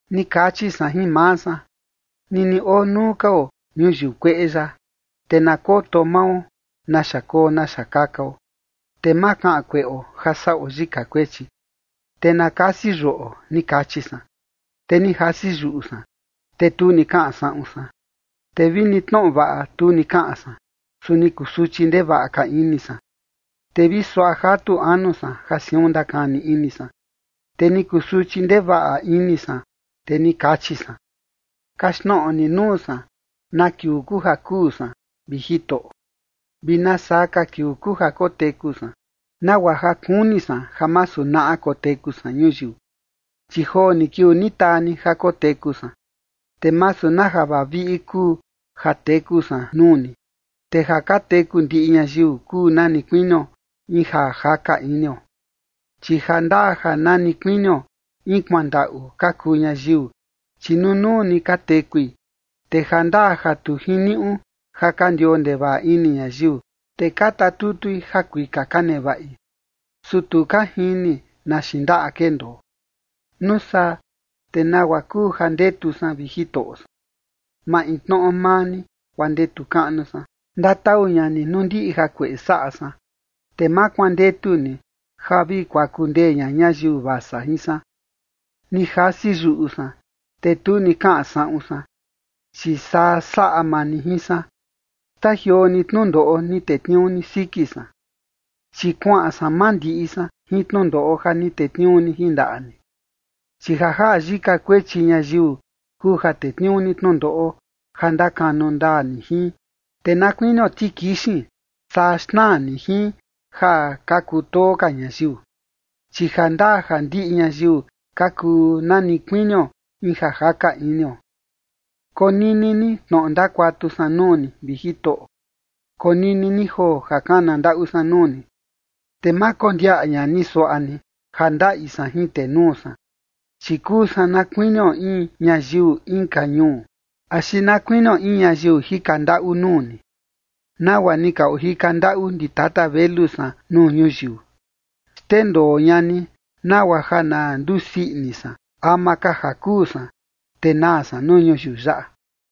Ni kachi san jin maa san: “Nini oo nuu ka oo ñayiu kueꞌe yaꞌa, te na koto mao naxa koo naxa kakao, te ma kaꞌan kueꞌo ja saꞌo yika kuechi, te na kasi yuꞌo”, ni kachi san. Te ni jasi yuꞌu san, te tu ni kaꞌan saꞌun san, te vini tnoꞌo vaꞌa, tu ni kaꞌan san, su ni kusuchi ndevaꞌa ka ini san. Te vi suaꞌa jatu anu san ja siun ndakani ini san, te ni kusuchi ndevaꞌa ini san, te ni kachi san: “Kaxtnoꞌo ni nuu san na kiuu kuu ja kuu san, vi Jitoꞌo, vi nasaa ka kiuu kuu ja koteku san, nagua ja kuni san ja masu naꞌa koteku san ñuyiu. Chi joo ni kiuu ni taa ni ja koteku san, te masu na ja vaviꞌi kuu ja teku san nuu ni. Te ja ka teku ndiꞌi ñayiu kuu nani kuinio in ja jaka inio. ’Chi jandaa ja nani kuinio in kuandaꞌu ka kuu ñayiu, chi nunuu ni ka tekui, te jandaa ja tu jiniuꞌu ja ka ndioo ndevaꞌa ini ñayiu, te ka tatutui ja kuika ka nevaꞌi, su tu ka jini na xiin ndaꞌa kendoo. ’Nuu saa, ¿te nagua kuu ja ndetu san, vi Jitoꞌo san? Maintnoꞌo maa ni, guaa ndetu kaꞌnu san. Ndatau ña ni nuu ndiꞌi jakueꞌe saꞌa san, te ma kuandetu ni ja vi kuaku ndee ña ñayiu vasa jin san. Ni jasi yuꞌu san, te tu ni kaꞌan saꞌun san, chi saa saꞌa maa ni jin san. Xtajioo ni tnundoꞌo ni tetniuu ni siki san, chi kuaꞌan san mandiꞌi san jin tnundoꞌo ja ni tetniuu ni jin ndaꞌa ni. Chi ja jaꞌa yika kuechi ñayiu kuu ja tetniuu ni tnundoꞌo ja ndakanu ndaa ni jin, te na kuinio tikixin, saa xnaa ni jin ja ka kutoo ka ñayiu, chi jandaa ja ndiꞌi ñayiu ka kuu nani kuinio in ja jaka inio. ’Konini ni tnoꞌo ndakuatu san nuu ni, vi Jitoꞌo. Konini ni joo ja kana ndaꞌu san nuu ni, te ma kondiaꞌa ña ni suaꞌa ni ja ndaꞌi san jin tenuu san. Chi kuu san na kuinio in ñayiu inka ñuu, axi na kuinio in ñayiu jika ndaꞌu nuu ni, nagua ni ka ojika ndaꞌu ndi tata velu san nuu ñuyiu. Xndendoo ña ni, nagua ja na ndusii ini san, ama ka ja kuu san, te naa san nuu ñuyiu yaꞌa.”